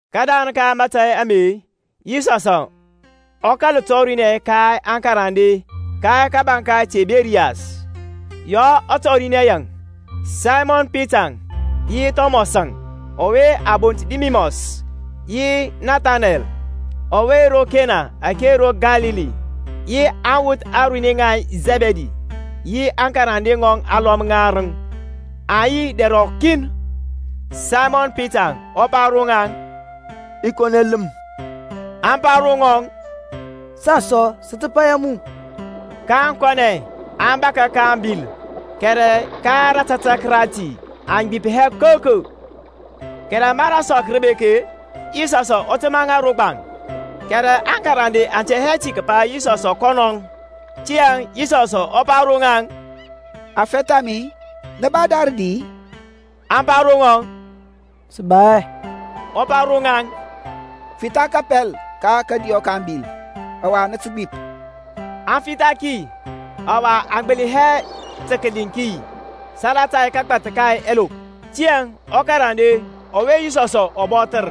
Kədarəŋ ka mȧtȧy ame Yisɔsȧŋ ɔ kȧl tɔrinɛ ka aŋkarande ka kȧbȧŋ ka Tiberias; ya ɔ tɔrinɛ yaŋ. Saymɔn Pitaŋ, yi Thɔmɔsȧŋ ɔwe a bont Didimɔs, yi Nathaneɛl ɔwe ro Kena ake ro Kalili, yi aŋwuth aruni ŋa Sɛbidi, yi aŋkarande ŋɔŋ alɔm ŋarəŋ, aŋ yi dɛr ɔkin. Saymɔn Pitaŋ ɔ pa ro ŋaŋ, I kɔnɛ ləm. Aŋ pa ro ŋɔŋ, Saŋ sɔ sə tə paya mu. Kaŋ kɔnɛ, aŋ bȧkȧ ka ȧŋbil; kɛrɛ ka rȧtȧtȧk rati aŋ gbip hɛ koko. Kɛrɛ ma rasɔk rə bek-e, Yisɔsȧŋ ɔ təmȧ ro gbaŋ; kɛrɛ aŋkarande aŋ tɛ ti kəpa Yisɔsȧŋ kɔnɔŋ. Tiyȧŋ Yisɔs ɔ pa ro ŋaŋ, Aŋfɛth a mi, nə ba da rədi-i? Aŋ pa ro ŋɔŋ, Sə ba hɛ. Ɔ pa ro ŋaŋ, Fitha kapɛl ka kȧdiyɔ ka ȧŋbil, ɔwa nə tə gbip. Aŋ fitha ki, ɔwa aŋ gbəli hɛ tə kəliŋ ki salata kagbath ka ɛlop. Tiyȧŋ ɔkarande ɔwe Yisɔsȧŋ ɔ bɔthər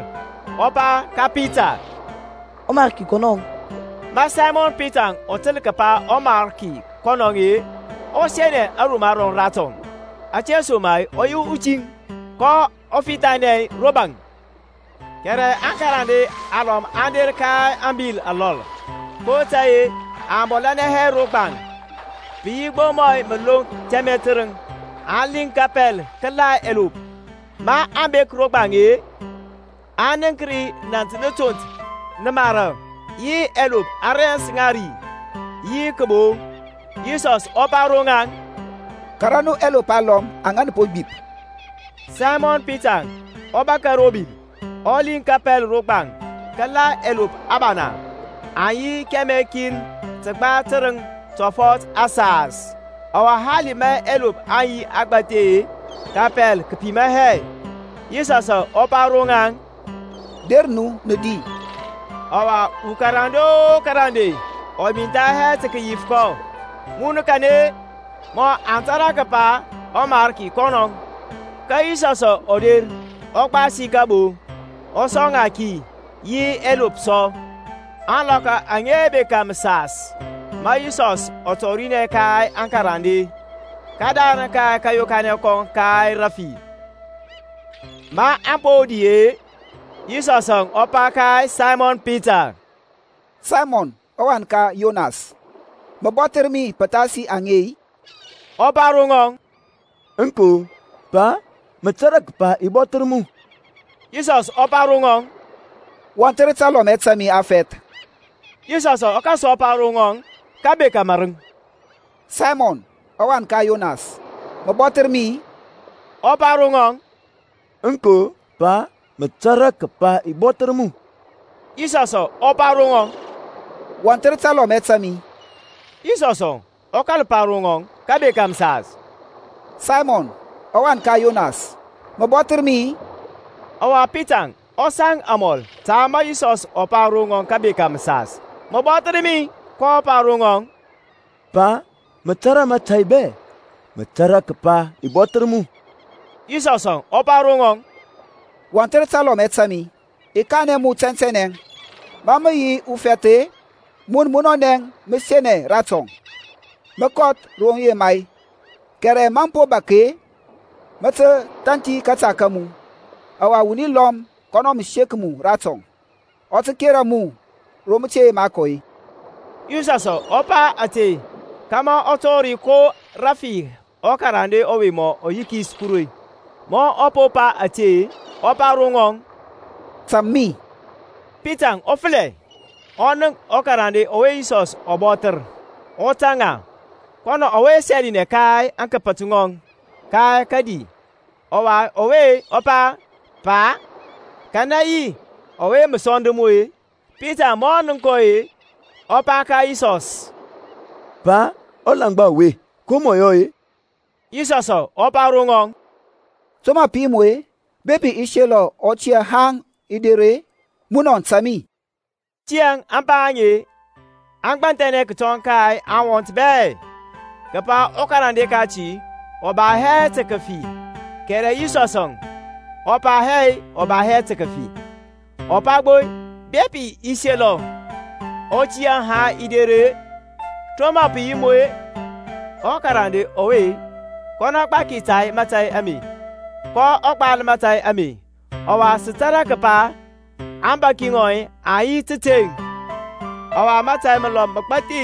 ɔ pa ka Pita, ƆMariki kɔnɔŋ. Ma Saymɔn Pitaŋ ɔ təl kəpa ɔMarki kɔnɔŋ-e, ɔ senɛ aruma rɔŋ ratɔŋ (ȧtesoma-e ɔ yi utiŋ), kɔ fithanɛ ro baŋ. Kɛrɛ aŋkarande alɔm aŋ der ka ȧŋbil alɔl; (kotȧy-e aŋ bɔlȧnɛ hɛ ro gbaŋ, pə yi gbo mɔ məloŋk tɛmɛ tərəŋ), aŋ liŋ kapɛl kəla ɛlop. Maŋ bek ro gbaŋ-e, aŋ nənk ri nȧnt na tont nə mara, yi ɛlop a rɛns ŋa ri, yi kəbo. Yisɔsȧŋ ɔ pa ro ŋaŋ, Kara nu ɛlop alɔm aŋa nə po gbip. Saymɔn Pitaŋ ɔ bȧkȧ ro bil, ɔ liŋ kapɛl ro gbaŋ kəla ɛlop abana, aŋ yi kɛmɛ kin təgba tərəŋ tɔfɔt asas: ɔwa hali ma ɛlop aŋ yi agbȧthi-e, kapɛl kə pima hɛ. Yisɔsȧŋ ɔ pa ro ŋaŋ, Der nu nə di. Ɔwa ukarande o karande ɔ mintha hɛ tə kəyif kɔ, Mun kanɛ-e? mɔ aŋ tȧrȧ kəpa ɔMarki kɔnɔŋ. Ka Yisɔsȧŋ ɔ der, ɔ gbasi kəbo, ɔ sɔŋ ŋa ki, yi ɛlop sɔ. Ȧŋlɔkɔ aŋe aŋ bekȧ məsas ma Yisɔsȧŋ ɔ tɔrinɛ ka aŋkarande, kədarəŋ ka kȧyokanɛ kɔŋ ka rafi. Maŋ po di-e, Yisɔsȧŋ ɔ pa ka Saymɔn Pita, Saymɔn ɔwan ka Yɔnas, mə bɔthər mi pəthasi aŋe-i? Ɔ pa ro ŋɔŋ, Aŋko, Pa, mə tȧrȧ kəpa i bɔthər mu. Yisɔsȧŋ ɔ pa ro ŋɔŋ, Wɔnthər talɔmɛ ta mi afɛth. Yisɔsȧŋ ɔ kȧl sɔ pa ro ŋɔŋ kəbeka mȧrəŋ, Saymɔn, ɔwan ka Yɔnas, mə bɔthər mi-i? Ɔ pa ro ŋɔŋ, Aŋko, Pa, mə tȧrȧ kəpa i bɔthər mu. Yisɔsȧŋ ɔ pa ro ŋɔŋ, Wɔnthər talɔmɛ ta mi. Yisɔsȧŋ ɔ kȧl pa ro ŋɔŋ kəbeka məsas, Saymɔn, ɔwan ka Yɔnas, mə bɔthər mi-i? Ɔwa Pita ɔ saŋ amɔl ta ma Yisɔs ɔ pa ro ŋɔŋ kəbeka məsas, Mə bɔthər mi-i? kɔ pa ro ŋɔŋ, Pa, mə tȧrȧ mȧtȧy bɛ; mə tȧrȧ kəpa i bɔthər mu. Yisɔsȧŋ ɔ pa ro ŋɔŋ, Wɔnthər talɔmɛ ta mi. I kanɛ mu tɛntɛnɛ, ma mə yi ufɛth-e, mun munɔnɛ mə senɛ ratɔŋ, mə kɔth ro mə yema-e: kɛrɛ ma mə po bȧk-e, mə tə thanthi mȧta ma mu, ɔwa wuni lɔm kɔnɔ mə sek mu ratɔŋ, ɔ tə kera mu ro mə te yema kɔ-e. Yisɔsȧŋ ɔ pa ȧte, kȧmȧ ɔ tɔri ko rəfi ɔkarande ɔwe mɔ yikis Kuru. Ma ɔ po pa ȧte, ɔ pa ro ŋɔŋ, Tȧŋ mi. Pitaŋ ɔ fəlɛ, ɔ nənk ɔkarande ɔwe Yisɔs ɔ bɔthər ɔ tȧŋ ŋa; kɔnɔŋ ɔwe sɛlinɛ ka aŋkəpət ŋɔŋ ka kadi, ɔwa ɔwe pa, Pa, kanɛ yi ɔwe mə sɔnd mu-e? Pitaŋ ma ɔ nənk kɔ-e, ɔ pa ka Yisɔs, Pa, ɔlaŋgba ɔwe, ko mɔ yɔ-e? Yisɔsȧŋ ɔ pa ro ŋɔŋ, To mə pə yi mu-e, bepi i selɔ ɔ tiyȧ haŋ i der-e? Munɔ tȧŋ mi. Tiyȧŋ ȧŋpa aŋe aŋ gbanthɛnɛ kətɔŋ ka aŋwɔnt bɛ, kəpa ɔkarande kati ɔ ba hɛ tə kəfi: kɛrɛ Yisɔsȧŋ ɔ pa hɛ ɔ ba hɛ kəfi; ɔ pa gbo, Bepi i selɔ ɔ tiyȧ haŋ i der-e, to mə pə yi mu-e? Ɔkarande ɔwe kɔnɔ gbaki ta mȧtȧy ame, kɔ gbal mȧtȧy ame: ɔwa sə tȧrȧ kəpa aŋgbaki ŋɔŋ aŋ yi tȧteŋ. Ɔwa mȧtȧy məlɔm məgbathi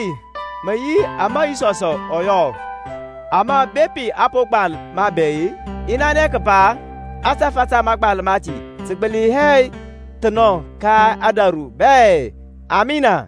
mə yi ama Yisɔsȧŋ ɔ yɔ, ama, bepi a po gbal ma bɛ-e, i nanɛ kəpa ȧtȧfȧ ta mȧgbal mati tə gbəli hɛ thənɔ ka ȧdȧru bɛ. Amina.